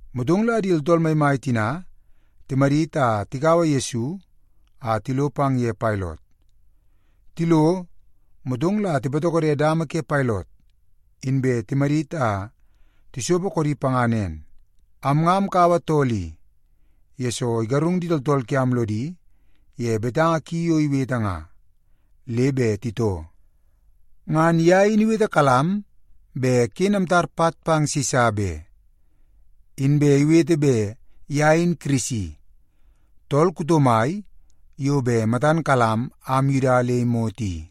Motong la di tooltool maimai tina timadit a tikaua Yesu a tilo pang ye Pailot. Tilo, motong la tipatokode dama ke Pailot, inbe timadit a tisopo koodi panga nen, “Am nga amkaua tool i, yesoo igarung di tooltool kiam lodi ye betanga ki yo iwete nga, le bet titoo. Ngan ye in iwetekalam bet ken amtar pat pang Sisa be, inbe iwete bet ye in Kirisi, tool kuto mai yo bet matan kalam am Yuda nga le imot i.”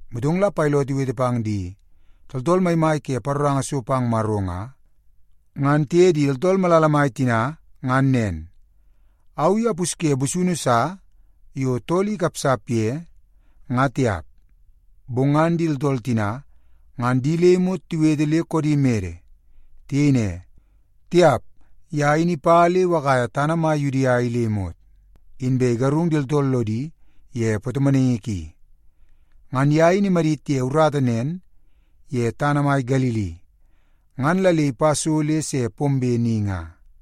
Motong la Pailot iwete pang di tooltool maimai ke paroranga so pang Maro nga, ngan tiye di tooltool malala mai tina ngan nen, “Au i apusye busunu sa yo tool i ikapsap ye, nga tiap.” Bong ngan di tooltool tina ngan di le imot tiwete le koodi mede. Tiyei ne, “Tiap, ye in ipa le iwakaia tana mai Yudia i le imot, inbe igarung di tooltool lodi ye patomonaingi ki. Ngan ye in imadit ye urata nen ye tana mai Galili, ngan la le ipa so le se pombe ni nga.”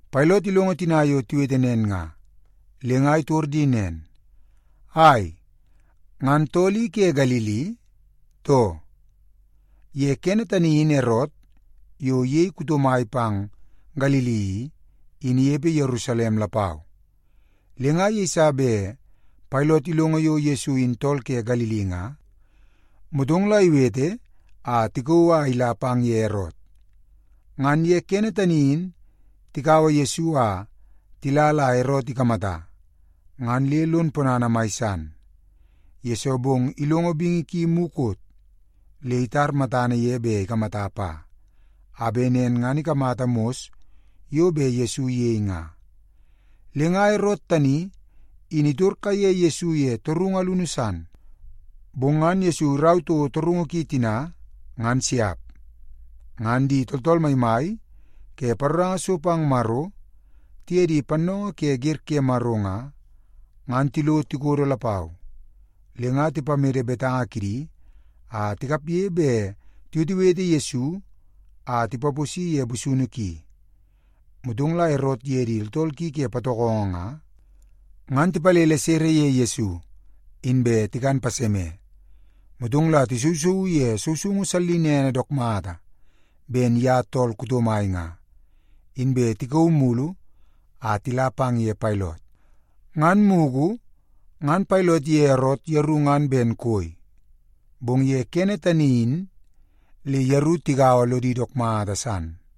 Pailot ilongo tina yo tiwete nen nga, le nga itor di nen, “Ai, ngan tool i ke Galili, too?” Ye kene tani in Erot, yo iyei tool kuto mai pang Galili i, in inepe Yerusalem lapau. Le nga yeiso bet Pailot ilongo yo Yesu in tool ke Galili nga, motong la iwete a tikauu a ila pang ye Erot. Ngan kene tani in tikaua Yesu a tila la Erot ikamata, ngan le lon ponana mai san, yesoo bong ilongo bingi ki mukot, le itar matana ye bet ikamata pa, a bet nen ngan ikamata mos yo bet Yesu iyei nga. Le nga Erot tani in itor kaiye Yesu ye torungu alunu san, bong ngan Yesu irau toko torungu ki tina, ngan siap. Ngan di tooltool maimai ke paroranga so pang Maro, tiye di pannoongoo ke wer ke Maro nga, ngan tilo tikodo lapau, le nga tipamede betanga kidi a tikapge bet tiwetewete Yesu a tipaposi ye busunu ki. Motong la Erot iye di tooltool ki ke patokongo nga, ngan tipalele sere ye Yesu, inbe tikan paseme. Motong la tisousouu ye sousoungu sallinene dook mata ben ye tool kuto mai nga, inbe tikauu mulu a tila pang ye Pailot. Ngan mugu ngan Pailot iye Erot yeru ngan ben koi, bong ye kene tani in le yeru tigaua lodi dook mata san.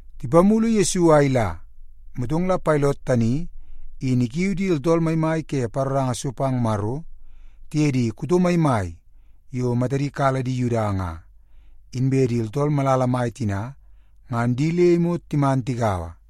Tipamulu Yesu a ila, motong la Pailot tani in ikiui di tooltool maimai ke paroranga so pang Maro tiye di kuto maimai yo matadi kala di Yuda nga, inbe di tooltool malala mai tina ngan di le imot timan tigaua,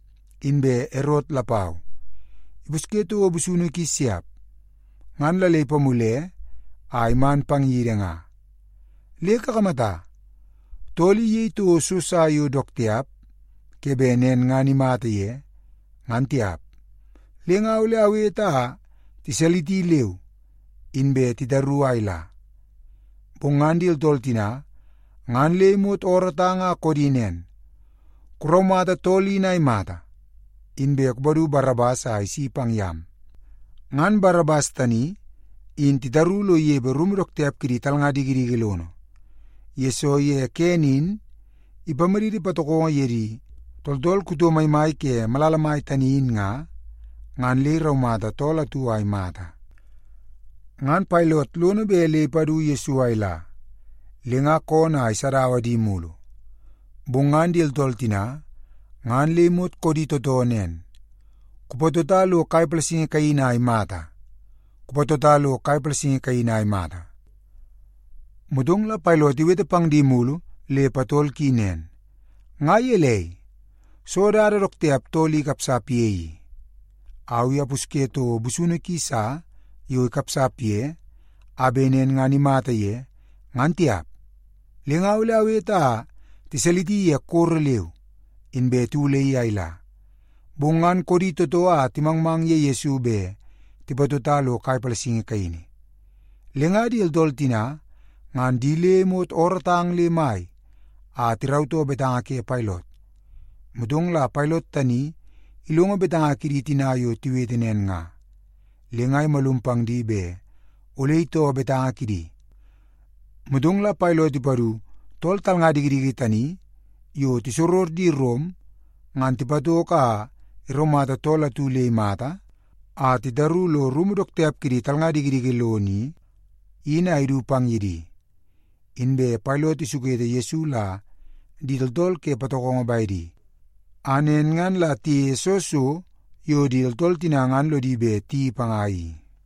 Inbe Erot lapau ipusye toko busunu ki siap, ngan la le ipamule a iman pang yidi nga. Le kakamata, tool i iyei toko so sa yo dook tiap ke bet nen ngan imata ye, ngan tiap. Le nga ole awete a tiwalisi leu, inbe titaru a ila.” Bong ngan di tooltool tina ngan le imot oorootang a koodi nen, “Kuraumata tool in a imata! Inbe kupadu Barabas a isi pang yam.” (Ngan Barabas tani in titaru lo inepe rumu dook tiap kidi talnga dikidiki lono, yesoo ye kene in ipamaditi patokongo ye di tooltool kuto maimai ke malala mai tani in nga, ngan le iraumata tool atu a imata.) Ngan Pailot lono bet le ipadu Yesu a ila, le nga koonoo a isadaua di mulu. Bong ngan di tooltool tina ngan le imot koodi tootoo nen, “Kupatota lo kai palasingi kaini a imata! Kupatota lo kai palasingi kaini a imata!” Motong la Pailot iwete pang di mulu le patol ki nen, “Nga gelei? Soo dada dook tiap tool i ikapsap ye i? Au i apusye toko busunu ki sa yo ikapsap ye, a bet nen ngan imata ye, ngan tiap. Le nga ole awete a tiwalisi ye koro leu, inbe tiwulaii a ila.” Bong ngan koodi tootoo a timangmang ye Yesu bet tipatota lo kai palasingi kaini. Le nga di tooltool tina ngan di le imot oorootang le mai a tirautoo betanga ke Pailot. Motong la Pailot tani ilongo betanga kidi tina yo tiwete nen nga, le nga imalum pang di bet ole itoo betanga kidi. Motong la Pailot ipadu tool talnga dikidiki tani yo tisoror di Rom ngan tipatoko a iraumata tool atu le imata a titaru lo rumu dook tiap kidi talnga dikidiki lono i, in a idu pang ye di. Inbe Pailot isukete Yesu la di tooltool ke patokongo bedi, a nen ngan la tiyeie soo so yo di tooltool tina ngan lodi bet tiyeii panga i.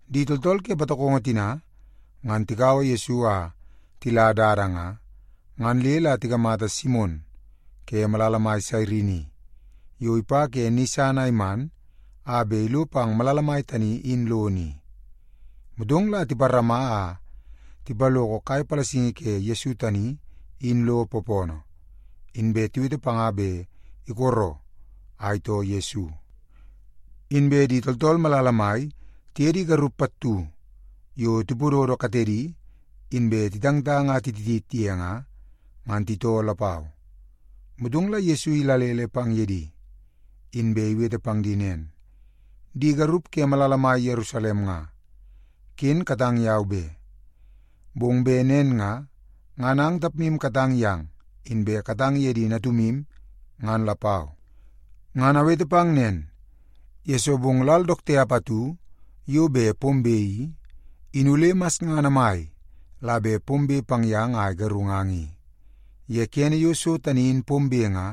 Di tooltool ke patokongo tina ngan tikaua Yesu a tila dada nga, ngan le la tikamata Simon ke malala mai Sairini yo ipa ke ni san a iman a bet ilo pang malala mai tani in lono i. Motong la tiparama a tipaloko kai palasingi ke Yesu tani in lo poopoonoo, inbe tiwete panga bet isola a itoo Yesu. Inbe di tooltool malala mai tiye di garup pattu yo tipododo katedi inbe titangtang a tititit ye nga, ngan titoo lapau. Motong la Yesu idalele pang ye di, inbe iwete pang di nen, “Di garup ke malala mai Yerusalem nga, ken katang yau be. Bong bet nen nga, ngan ang tapmu katang yang inbe katang ye di natumu ngan lapau. Ngan awete pang nen, yesoo bong lal dook tiap atu yo bet pombe i, in ole masngana mai la bet pombe pang yang a igarungang i. Ye kene yo so tani in pombe nga,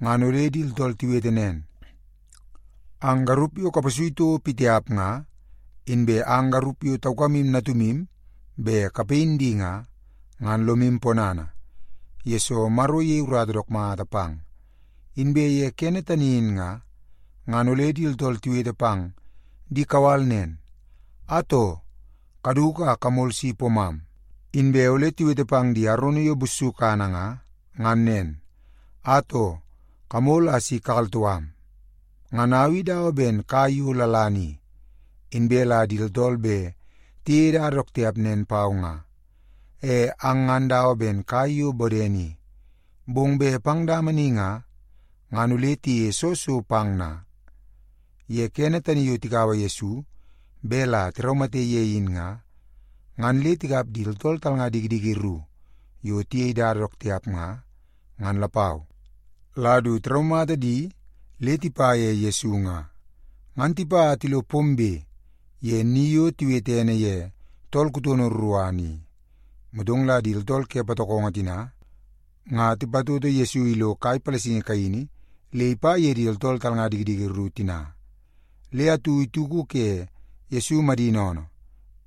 ngan ole di tooltool tiwete nen, ‘Ang garup yo kapasui toko pitiap nga, inbe ang garup yo taukamu natumu bet kapayin di nga, ngan lomu ponana, yesoo Maro iyei urata dook mata pang.’ Inbe ye kene tani in nga, ngan ole di tooltool tiwete pang di kawal nen, ‘Atoo, kaduku a kamol si poomam!’ Inbe ole tiwete pang di arono yo bussukana nga, ngan nen, ‘Atoo, kamol a si kakaltoo am!’ Ngan au i dawa ben kai yo lalana i, inbe la di tooltool bet tiyeie dada dook tiap nen pau nga. E ang ngan dawa ben kai yo bodene i, bong bet pang dama ni nga, ngan ole tiyeie soo so pang na?” Ye kene tani yo tikaua Yesu bet la tiraumate ye in nga, ngan le tikap di tooltool talnga dikidiki ru yo tiyei dada dook tiap nga, ngan lapau, la du tiraumata di le tipa ye Yesu nga. Ngan tipa a tilo pombe ye ni yo tiwete ene ye Tool Kutono Ruruana i, motong la di tooltool ke patokongo tina nga tipatoto Yesu ilo kai palasingi kaini le ipa ye di tooltool talnga dikidiki ru tina. Le atu ituku ke Yesu madini oonoo,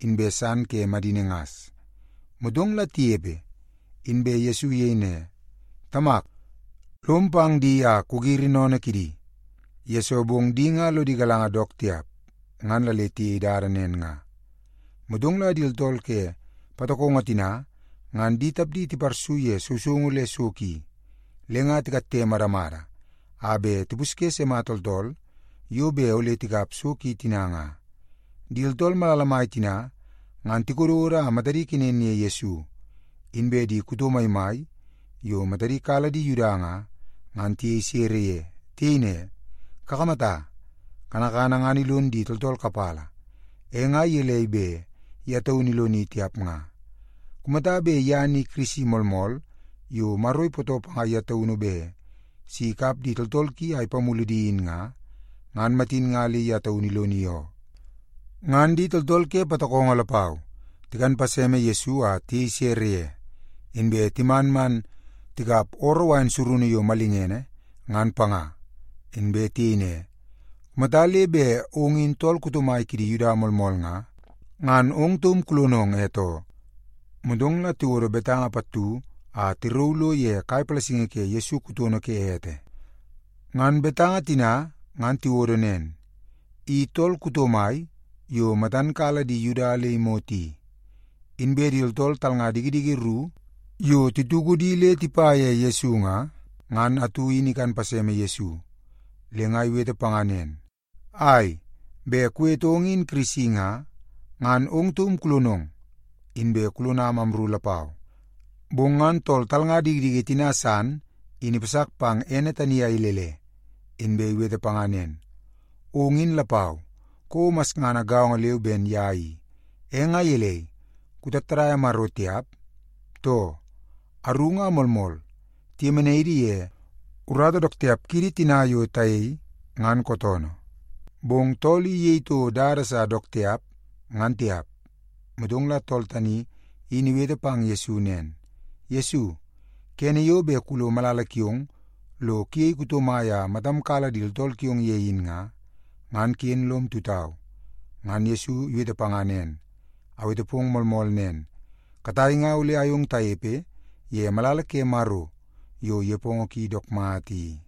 inbe san ke madini ngas. Motong la tinepe, inbe Yesu iyei ne, “Tamak, lom pang di a kugiri sennene kidi, yesoo bong di nga lodi galanga dook tiap ngan la le tiyei dada nen nga.” Motong la di tooltool ke patokongo tina ngan di tapdi tiparsu ye sousoungu le so ki, le nga titoo moonoo kidi a tikatte madamada a bet tipusye sima tooltool yo bet ole tikap so ki tina nga. Di tooltool malala mai tina ngan tikododo a matadi kenen ye Yesu, inbe di kuto maimai yo matadi kala di Yuda nga, ngan tiyei sere ye. Tiyei ne, “Kakamata, kanakana ngan ilon di tooltool kapala, e nga gelei bet ye taunu iloni tiap nga? Kumata bet ye ni Kirisi moolmool yo Maro ipootoo panga ye taunu bet si ikap di tooltool ki a ipamulu di in nga, ngan matin nga le ye taunu iloni oo.” Ngan di tooltool ke patokongo lapau tikan paseme Yesu a tiyei sere ye, inbe timan man tikap ooroo wain surunu yo malingene ngan panga. Inbe tiyei ne, “Kumata le bet ong in tool kuto mai kidi Yuda moolmool nga, ngan ong taum kulonong e too.” Motong la tiwodo betanga pattu a tirauu lo ye kai palasingi ke Yesu kutono ke ete. Ngan betanga tina ngan tiwodo nen: I Tool Kuto Mai Yo Matan Kala Di Yuda Le Imot I. Inbe di tooltool talnga dikidiki ru yo tituku di le tipa ye Yesu nga, ngan atu in ikan paseme Yesu, le nga iwete panga nen, “Ai, bet kuwete ong in Kirisi nga, ngan ong taum kulonong, inbe kulonam amru lapau!” Bong ngan tool talnga dikidiki tina san in ipasak pang ene tani a ilele, inbe iwete panga nen, “Ong in lapau kouo masngana gaongo leu ben ye i, e nga gelei, kutattadaia Maro tiap, too? Aru nga moolmool, tiyemenai idi ye urata dook tiap kidi tina yo tayei, ngan kootoonoo. Bong tool i iyei toko dada sa dook tiap, ngan tiap.” Motong la tool tani in iwete pang Yesu nen, “Yesu, kene yo bet kulo malala kiong lo kuyei kuto mai a matam kala di tooltool kiong ye in nga, ngan ken lom tutau.” Ngan Yesu iwete panga nen, “Awete pong moolmool nen, katai nga ole ayong tanepe ye malala ke Maro yo nepongo ki dook mata i.”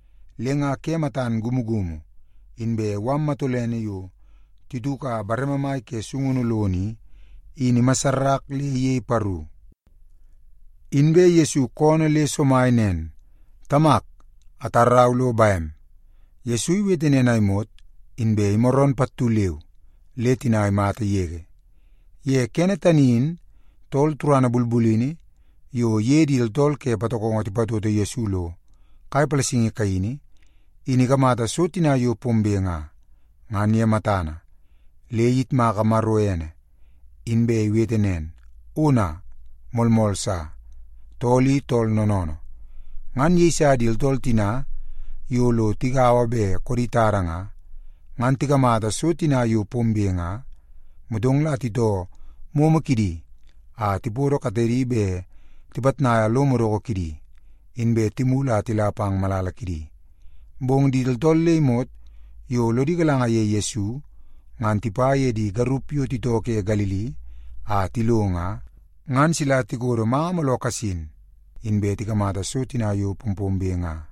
Le nga ke matan ikumukumu, inbe mala matolene yo tituka bareme mai ke sungunu lono i, in imassarak le iyei paru. Inbe Yesu koonoo le somai nen, “Tamak, atarau lo bem.” Yesu iwete nen a imot, inbe imaroon pattu leu le tina imata yege. Ye kene tani in tool turana bulbulini yo iye di tooltool ke patokongo tipatoto Yesu lo kai palasingi kaini, in ikamata so tina yo pombe nga, ngan ye matana, le iyitmaka Maro ene, inbe iwete nen, “Ona, moolmool sa, tool i tool noonoonoo.” Ngan yeiso di tooltool tina yo lo tigaua bet koodi tada nga, ngan tikamata so tina yo pombe nga, motong la titoo momo kidi a tipodo katedi bet tipitnaia lo madoko kidi, inbe timulu a tila pang malala kidi. Bong di tooltool le imot yo lodi galanga ye Yesu, ngan tipa ye di garup yo titoo ke Galili a tilo nga, ngan sila tikodo manga mooloo kasin, inbe tikamata so tina yo pompombe nga.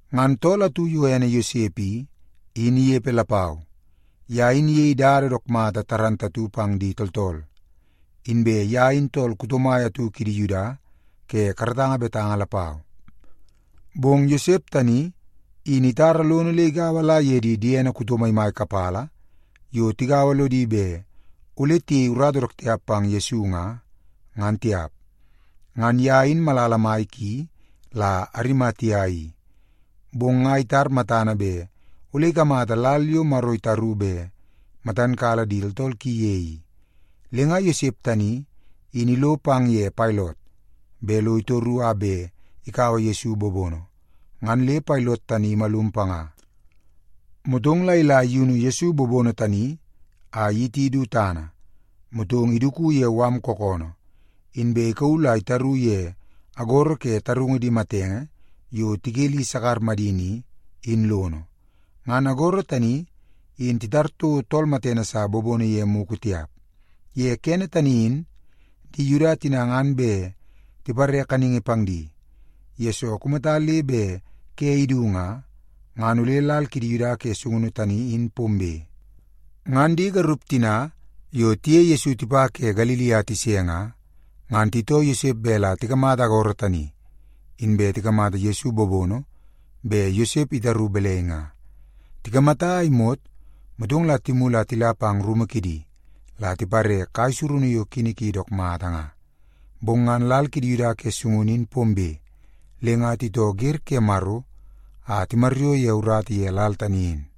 Ngan tool atu yo ene Yosep i, in inepe lapau. Ye in iyei dada dook mata pang di tooltool, inbe ye in tool kuto mai atu kidi Yuda ke karatanga betanga lapau. Bong Yosep tani in itara lono le igaua la ye di diene kuto maimai kapala yo tigaua lodi bet ole tiyei urata dook tiap pang Yesu nga, ngan tiap. Ngan ye in malala mai ki la Arimatia i, bong nga itar matana bet ole ikamata lal yo Maro itaru bet matan kala di tooltool ki ye i. Le nga Yosep tani in ilo pang ye Pailot bet lo itoru a bet ikaua Yesu bobono, ngan le Pailot tani imalum panga. Motong la ila iyunu Yesu bobono tani a iyiti du tana, motong iduku ye mala kookoonoo, inbe ikauu la itaru ye agoro ke tarungu di matenge yo tikeli sakar madini i, in lono. Ngan agoro tani in titar toko tool matene sa bobono ye mugu tiap. Ye kene tani in di Yuda tina ngan bet tipare kaningi pang di, yesoo kumata le bet ke idu nga, ngan ole lal kidi Yuda ke sungunu tani in pombe. Ngan di garup tina yo tiye Yesu tipa ke Galili a tise nga, ngan titoo Yosep bet la tikamata agoro tani, inbe tikamata Yesu bobono bet Yosep itaru balai nga. Tikamata a imot, motong la timulu a tila pang rumu kidi la tipare kai surunu yo kini ki dook mata nga. Bong ngan lal kidi Yuda ke sungunu in pombe, le nga titoo wer ke Maro a timaryoo ye urata ye lal tani in.